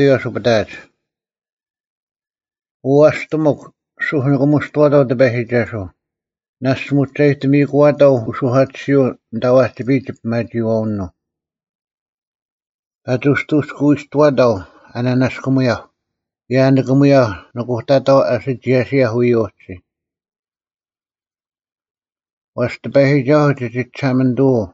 Year A) 1ᐅ ᐊᔅᑎᒧᒄ, ᓱᒃ ᓂᑭᒧᔅᑐᐛᑕᐤ ᑎᐸᔨᒋᒐᓱᐤ: ᓇᔅᒡ ᒧᒋᒐᔨᑎᒥᐃᑯᐛᑕᐤ ᐅᓱᐧᑲᑎᓯᐅᓐ ᐊᓐᑕ ᐛᒋᐱᔨᒡ ᒋᐱᒪᒋᐃᐛᐅᓄᐤ᙮ 2ᐸᒋ ᐅᑎᔅᑯᐎᔅᑯᐛᑕᐤ ᐊ ᓂᓇᔅᑯᒧᔭᐧᒄ, ᑭᔭ ᐊ ᓂᑭᒧᔭᐧᒄ ᓄᑯᑕᑕᐤ ᐊ ᓯᒋᔭᓯᔭᐧᒄ ᐎᔭ ᐅᒋ᙮ 3ᐛᔅ ᑎᐸᔨᒋᒐᓱᐤ ᒋᒋ ᒋᓴᒪᓂᑐᐅ,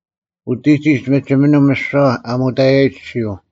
ᐅᑎᒋᒡ ᒥᒋᒥᓂᒻ ᒥᓯᐛ ᐊ ᒧᑕᔭᔨᒡ ᐊᔅᒋᔪᐤ: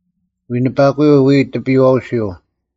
ᐎᓂᐸᑯᔪᐤ ᐎᔾ ᑎᐱᔨᐛᐅᓯᐤ,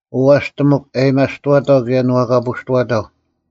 ᐅ ᐊᔅᑎᒧᒄ ᐊᔭᒥᐊᔅᑐᐛᑕᐤ ᑭᔭ ᓇᐛᑲᐳᔅᑐᐛᑕᐤ,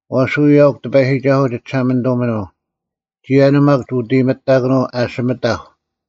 ᐛᔅ ᐎᔾ ᐊᐅᒄ ᑎᐸᔨᒋᒐᓱᐤ ᒋᒋᓴᒪᓂᑐᒥᓄᐤ; ᒋᔭᓄᐤ ᒪᒃ ᒋ ᐅᑦ ᐃᔨᒥᑐᑕᑯᓄᐤ ᐊᓯᒥᑕᐧᒄ,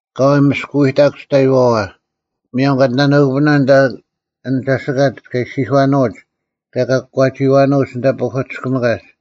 ᐊᑲᐎᔾ ᒥᔅᑯᐎᑕᒄ ᒋᑕᐃᐛᐛ, ᒧᔭᒻ ᑲ ᑎᓇᓄᑯᐱᓇ ᐊᓐ ᒐᓯᑲᒡ ᑲ ᒋᔄᐃᐛᓂᐅᒡ, ᑭᔭ ᑲ ᑯᒂᒋᐃᐛᓄᐅᒡ ᐊᓐᑕ ᐸᐧᑯᑎᔅᑭᒥᑲᒡ: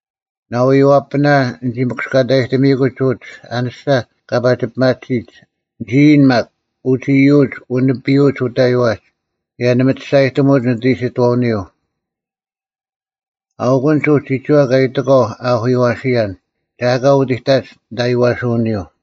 ᓇᐎᔪᐛᐳᓇ ᓂᒋ ᒥᑯᔅᑲᑕᔨᑎᒥᐃᑯᒡ ᐅᒡ ᐊᓂᔅᒐ ᑲ ᐸᒋ ᐱᒪᑎᓯᒡ, ᓂᒋ ᐃᔨᓐ ᒪᒃ, “ᐅᒡ ᐃᔪᒡ ᐛᐛᓂᐱᔪᐅᒡ ᐅᑕᐃᐛᒡ, ᑭᔭ ᓇᒪ ᒋ ᒋᔅᒐᔨᑎᒧᒡ ᓂᑦ ᐃᓯᑥᐅᓂᔪᐤ᙮” ᐊᐅᑯᓐᒡ ᐅᒡ ᒋᒋᐛ ᑲ ᐃᑎᒂᐤ ᐊ ᐊᐧᑯᔪᐛᓯᔭᓐ, “ᒐ ᐊᑲ ᐅᑎᑕᒡ ᓂᑦ ᐊᔽᓯᐅᓂᔪᐤ᙮”